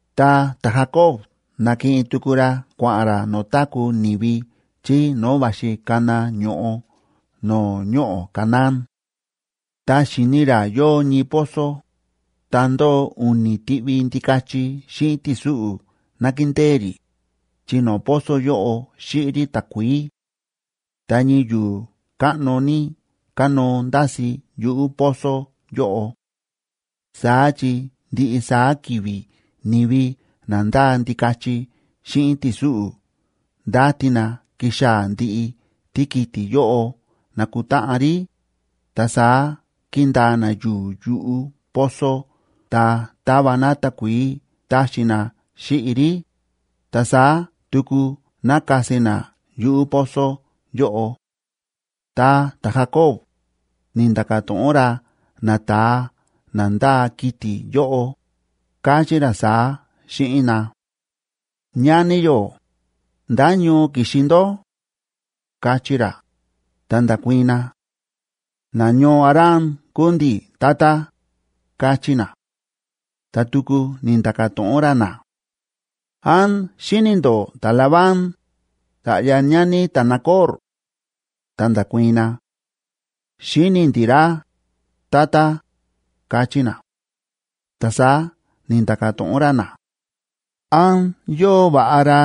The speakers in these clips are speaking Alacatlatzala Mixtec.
Ta ta̱Jacob na̱kiꞌin tuku ra kua̱ꞌa̱n ra no̱o̱ táku̱ ni̱vi chí no̱o̱ va̱xi kana ño̱ꞌo no̱o̱ ñoꞌo̱ Canaán. Ta xi̱ni ra yóo ñii pozo, ta ndóo u̱ni̱ tiꞌvi ndikachi xíꞌin ti̱súꞌu̱ nákindée rí, chi no̱o̱ pozo yóꞌo xíꞌi rí takuií. Ta ñii yu̱u̱ káꞌno ní kánóo ndási̱ yuꞌu̱ pozo yóꞌo. Saá chi ndiꞌi saá ki̱vi̱ ni̱vi na ndáa ndikachi xíꞌin ti̱súꞌu̱ ndáti na kixaa̱ ndiꞌi tíkiti̱ yóꞌo nakutáꞌan rí, ta saá kíndaa na yu̱u̱ yuꞌu̱ pozo ta táva na takuií táxi na xíꞌi rí, ta saá tuku nákasi na yuꞌu̱ pozo yóꞌo. Ta ta̱Jacob ni̱nda̱ka̱ to̱ꞌon ra nata̱a na ndáa kiti̱ yóꞌo, káchí ra saá xíꞌin na: ―Ñani yó, ¿ndá ñoo ki̱xi ndó? ―káchí ra. Ta nda̱kuii̱n na: ―Nañoo Harán kúu ndi̱, tata ―káchí na. Ta tuku ni̱nda̱ka̱ to̱ꞌon ra na: ―¿Án xíni̱ ndó ta̱Labán, sa̱ꞌya ñani ta̱Nacor?a Ta nda̱kuii̱n na: ―Xíni̱ ndi̱ ra, tata ―káchí na. Ta saá ni̱nda̱ka̱ to̱ꞌon ra na: ―¿Án yóo va̱ꞌa ra?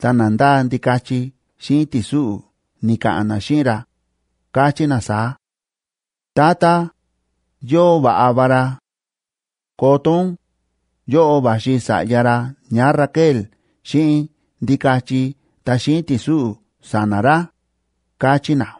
Ta na ndáa ndikachi xíꞌin ti̱súꞌu̱ ni̱ka̱ꞌa̱n na xíꞌin ra, káchí na saá: ―Tata, yóo va̱ꞌa va ra. Koto ún, yóꞌo va̱xi sa̱ꞌya ra ñáRaquel xíꞌin ndikachi ta xíꞌin ti̱súꞌu̱ sa̱na̱ ra ―káchí na.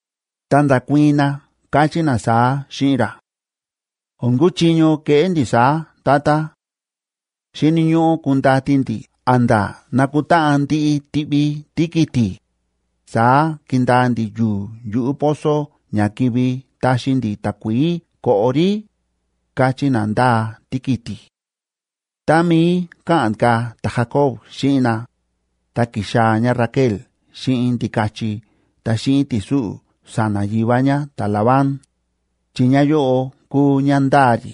Ta nda̱kuii̱n na, káchí na saá xíꞌin ra: ―O̱n kuchiño keꞌé ndi̱ saá, tata. Xíni̱ ñóꞌó kundati ndi̱ a̱nda̱ nakutáꞌan ndiꞌi tiꞌvi tíkiti̱, saá kindaa ndi̱ yu̱u̱ yuꞌu̱ pozo ña kivi taxi ndi̱ takuií koꞌo rí ―káchí na ndáa tíkiti̱. Tá mií káꞌa̱n ka̱ ta̱Jacob xíꞌin na, ta ki̱xaa̱ ñáRaquel xíꞌin ndikachi ta xíꞌin ti̱súꞌu̱ sa̱na̱ yivá ñá ta̱Labán, chi ñáyóꞌo kúu ñá ndáa rí.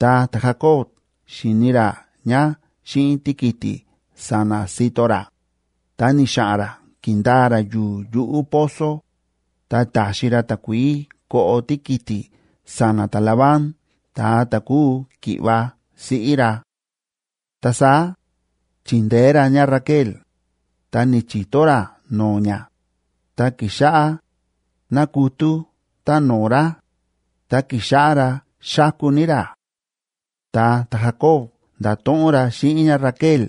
Tá ta̱Jacob xi̱ni ra ñá xíꞌin tíkiti̱ sa̱na̱ sito ra, ta ni̱xa̱ꞌa̱n ra ki̱ndaa ra yu̱u̱ yuꞌu̱ pozo, ta ta̱xi ra takuií koꞌo tíkiti̱ sa̱na̱ ta̱Labán ta̱a ta̱ kúu ki̱ꞌva̱ siꞌí ra. Ta saá chindeé ra ñáRaquel, ta ni̱chi̱to ra no̱o̱ ñá, ta ki̱xáꞌá nákutú táno̱o̱ ra, ta ki̱xáꞌá ra xáku ní ra. Ta ta̱Jacob nda̱to̱ꞌon ra xíꞌin ñáRaquel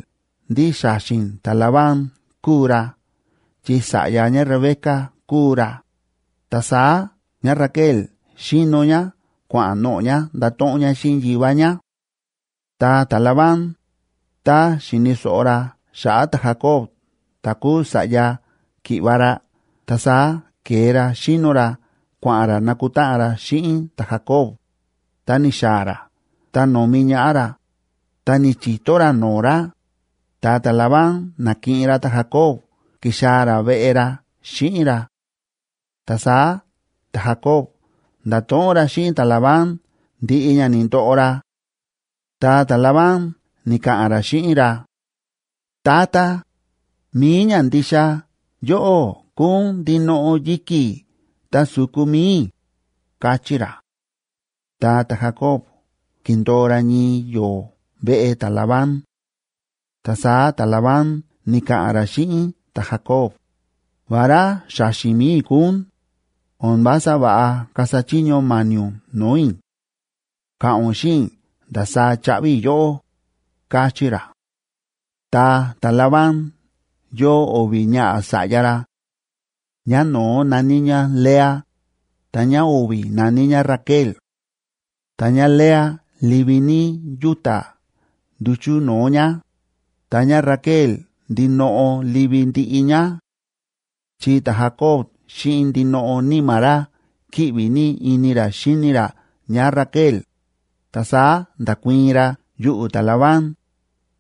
ndí xa̱xi̱n ta̱Labán kúu ra chi sa̱ꞌya ñáRebeca kúu ra, ta saá ñáRaquel xíno ñá kua̱ꞌa̱n noꞌo̱ ñá ndato̱ꞌon ñá xíꞌin yivá ñá. Ta ta̱Labán, tá xi̱ni̱ so̱ꞌo ra xa̱ꞌa̱ ta̱Jacob ta̱ kúu sa̱ꞌya ki̱ꞌva̱ ra, ta saá ke̱e ra xíno ra kua̱ꞌa̱n ra nakutáꞌan ra xíꞌin ta̱Jacob, ta ni̱xaa̱ ra ta no̱mi ñaꞌá ra, ta ni̱chi̱to ra no̱o̱ ra, ta ta̱Labán na̱kiꞌin ra ta̱Jacob ki̱xaa̱ ra veꞌe ra xíꞌin ra. Ta saá ta̱Jacob nda̱to̱ꞌon ra xíꞌin ta̱Labán ndiꞌi ña ni̱ndoꞌo ra. Ta ta̱Labán ni̱ka̱ꞌa̱n ra xíꞌin ra: ―Tata, mi̱i ñandixa yóꞌó kúu ún ndinoꞌo yi̱ki̱ ta su̱ku mi̱i i̱ ―káchí ra. Ta ta̱Jacob ki̱ndo̱o ra ñii yo̱o̱ veꞌe ta̱Labán. Ta saá ta̱Labán ni̱ka̱ꞌa̱n ra xíꞌin ta̱Jacob: ―Vará xa̱xi̱n mi̱i i̱ kúu ún, o̱n vása va̱ꞌa kasa chiño ma̱ni̱ ún no̱o̱ i̱. Ka̱ꞌa̱n ún xíꞌin i̱ ndasaá chaꞌvi i̱ yóꞌó ―káchí ra. Ta ta̱Labán yóo o̱vi̱ ñaꞌa̱ sa̱ꞌya ra; ñáno̱ó na̱ní ñá Lea, ta ñáo̱vi̱ na̱ní ñá Raquel. Ta ñáLea livi ní yúta̱ nduchu̱ no̱o̱ ñá, ta ñáRaquel ndinoꞌo livi ndiꞌi ñá. Chi ta̱Jacob xíꞌin ndinoꞌo níma̱ ra kíꞌvi ní ini ra xíni ra ñáRaquel, ta saá nda̱kuii̱n ra yuꞌu̱ ta̱Labán,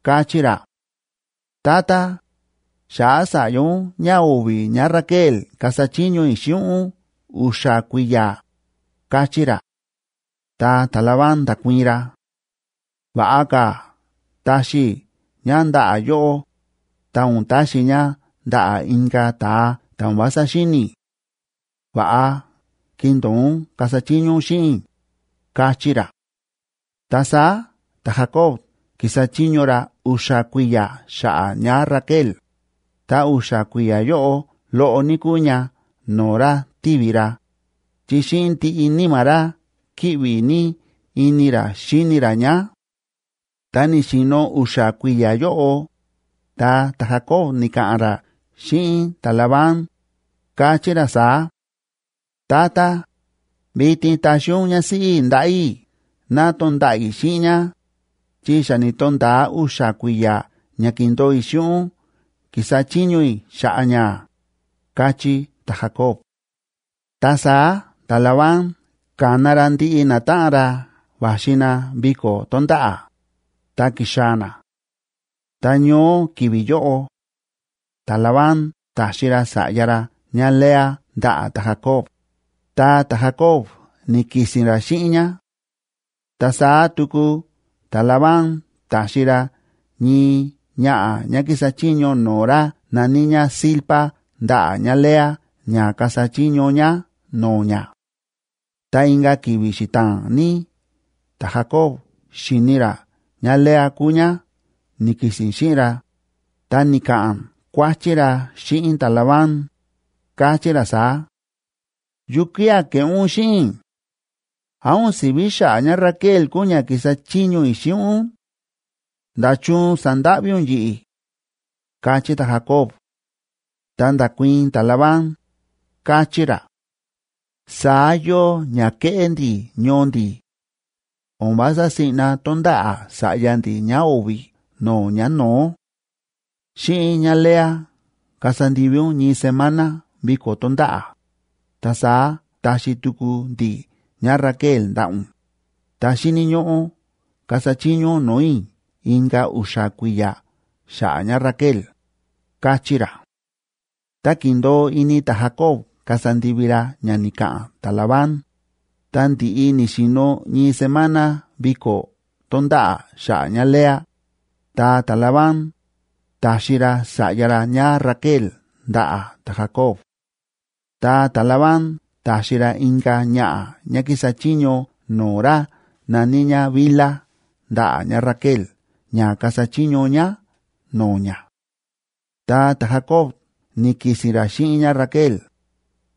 káchí ra: ―Tata, xa̱ꞌa̱ sa̱ꞌya ún ñáo̱vi̱ ñáRaquel kasa chiño i̱ xíꞌin ún u̱xa̱ kui̱ya̱ ―káchí ra. Ta ta̱Labán nda̱kuii̱n ra: ―Va̱ꞌa ka̱ taxi i̱ ñá ndaꞌa̱ yóꞌó, ta o̱n taxi i̱ ñá ndaꞌa̱ inka̱ ta̱a ta̱ o̱n vása xíni̱ i̱. Va̱ꞌa kindo̱o ún kasa chiño ún xíꞌin i̱ ―káchí ra. Ta saá ta̱Jacob ki̱sa chiño ra u̱xa̱ kui̱ya̱ xa̱ꞌa̱ ñáRaquel, ta u̱xa̱ kui̱ya̱ yóꞌo loꞌo ní kúu ña no̱o̱ ra tívi ra, chi xíꞌin ndiꞌi níma̱ ra kíꞌvi ní ini ra xíni ra ñá. Tá ni̱xi̱no̱ u̱xa̱ kui̱ya̱ yóꞌo, ta ta̱Jacob ni̱ka̱ꞌa̱n ra xíꞌin ta̱Labán, káchí ra saá: ―Tata, vitin taxi ún ñásíꞌí i̱ ndaꞌa̱ i̱ ná tonda̱ꞌa̱ i̱ xíꞌin ñá, chi xa ni̱to̱nda̱a u̱xa̱ kui̱ya̱ ña ki̱ndo̱o i̱ xíꞌin ún ki̱sa chiño i̱ xa̱ꞌa̱ ñá ―káchí ta̱Jacob. Ta saá ta̱Labán ka̱na ra ndiꞌi natáꞌan ra va̱xi na viko̱ tónda̱ꞌa̱, ta ki̱xaa̱ na. Ta ñoó ki̱vi̱ yóꞌo, ta̱Labán ta̱xi ra sa̱ꞌya ra ñáLea ndaꞌa̱ ta̱Jacob, ta ta̱Jacob ni̱ki̱si̱n ra xíꞌin ñá. Ta saá tuku ta̱Labán ta̱xi ra ñii ñaꞌa̱ ñá kísa chiño no̱o̱ ra na̱ní ñá Zilpa ndaꞌa̱ ñáLea ña kasa chiño ñá no̱o̱ ñá. Ta inka̱ ki̱vi̱ xita̱a̱n ní ta̱Jacob xi̱ni ra ñáLea kúu ñá ni̱ki̱si̱n xíꞌin ra, ta ni̱ka̱ꞌa̱n kuáchí ra xíꞌin ta̱Labán, káchí ra saá: ―¿Yukía̱ ke̱ꞌé ún xíꞌin i̱? ¿Án o̱n si̱ví xa̱ꞌa̱ ñáRaquel kúu ñá ki̱sa chiño i̱ xíꞌin ún? ¿Nda̱chun sa̱ndáꞌví ún yi̱ꞌi̱? ―káchí ta̱Jacob. Ta nda̱kuii̱n ta̱Labán, káchí ra: ―Saá yóo ña kéꞌé ndi̱ ñoo ndi̱: o̱n vása siꞌna tonda̱ꞌa̱ sa̱ꞌya ndi̱ ñáo̱vi̱ no̱o̱ ñáno̱ó. Xíꞌin ñáLea kasa ndivi ún ñii semana viko̱ tónda̱ꞌa̱, ta saá taxi tuku ndi̱ ñáRaquel ndaꞌa̱ ún, ta xíni̱ ñóꞌó kasa chiño ún no̱o̱ i̱ inka̱ u̱xa̱ kui̱ya̱ xa̱ꞌa̱ ñáRaquel ―káchí ra. Ta ki̱ndo̱o ini ta̱Jacob kasa ndivi ra ña ni̱ka̱ꞌa̱n ta̱Labán, ta ndi̱ꞌi ni̱xi̱no̱ ñii semana viko̱ tónda̱ꞌa̱ xa̱ꞌa̱ ñáLea, ta ta̱Labán ta̱xi ra sa̱ꞌya ra ñáRaquel ndaꞌa̱ ta̱Jacob. Ta ta̱Labán ta̱xi ra inka̱ ñaꞌa̱ ñá kísa chiño no̱o̱ ra na̱ní ñá Bilha ndaꞌa̱ ñáRaquel ña kasa chiño ñá no̱o̱ ñá. Ta ta̱Jacob ni̱ki̱si̱n ra xíꞌin ñáRaquel,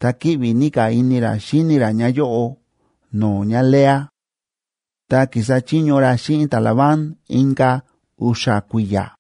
ta kíꞌvi ní ka̱ ini ra xíni ra ñáyóꞌo no̱o̱ ñáLea. Ta ki̱sa chiño ra xíꞌin ta̱Labán inka̱ u̱xa̱ kui̱ya̱.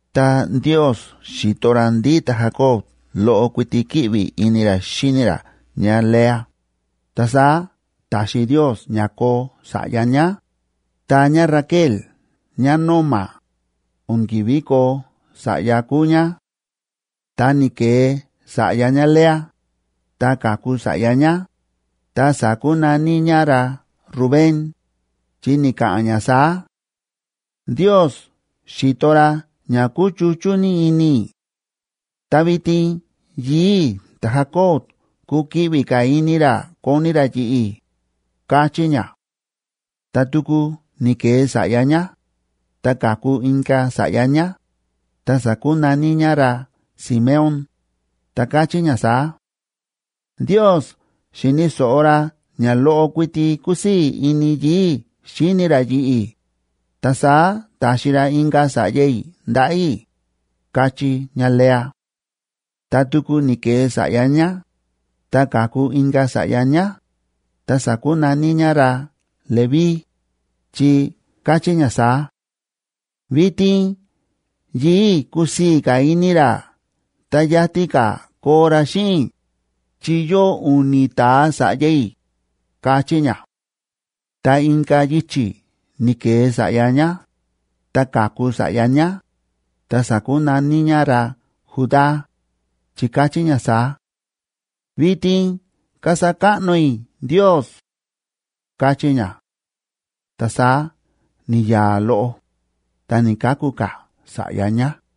Tá Ndiosb xi̱to ra ndí ta̱Jacob loꞌo kuiti kíꞌvi ini ra xíni ra ñáLea, ta saá ta̱xi Ndios ña koo sa̱ꞌya ñá, ta ñáRaquel ñánóma, o̱n ki̱ví koo sa̱ꞌya kúu ñá. Ta ni̱ke̱e sa̱ꞌya ñáLea, ta ka̱ku sa̱ꞌya ñá, ta sa̱kunaní ñá ra Rubén,c chi ni̱ka̱ꞌa̱n ñá saá: “Ndios xi̱to ra ña ku̱chuchú ní ini i̱. Ta vitin yii̱ i̱ ta̱Jacob kukiꞌvi ka̱ ini ra koni ra yi̱ꞌi̱”, káchí ñá. Ta tuku ni̱ke̱e sa̱ꞌya ñá, ta ka̱ku inka̱ sa̱ꞌya ñá, ta sa̱kunaní ñá ra Simeón,d ta káchí ñá saá: “Ndios xi̱ni̱ so̱ꞌo ra ña loꞌo kuiti kúsii̱ ini yii̱ i̱ xíni ra yi̱ꞌi̱, ta saá ta̱xi ra inka̱ sa̱ꞌya i̱ ndaꞌa̱ i̱”, káchí ñáLea. Ta tuku ni̱ke̱e sa̱ꞌya ñá, ta ka̱ku inka̱ sa̱ꞌya ñá, ta sa̱kunaní ñá ra Leví,e chi káchí ñá saá: “Vitin yii̱ i̱ kusii̱ ka̱ ini ra ta yatin ka̱ koo ra xíꞌin i̱, chi yóo u̱ni̱ ta̱a sa̱ꞌya i̱”, káchí ñá. Ta inka̱ yichi̱ ni̱ke̱e sa̱ꞌya ñá, ta ka̱ku sa̱ꞌya ñá, ta sa̱kunaní ñá ra Judá,f chi káchí ñá saá: “Vitin kasa káꞌno i̱ Ndios”, káchí ñá. Ta saá ni̱ya̱a̱ loꞌo, ta ni̱‑kaku ka̱ sa̱ꞌya ñá.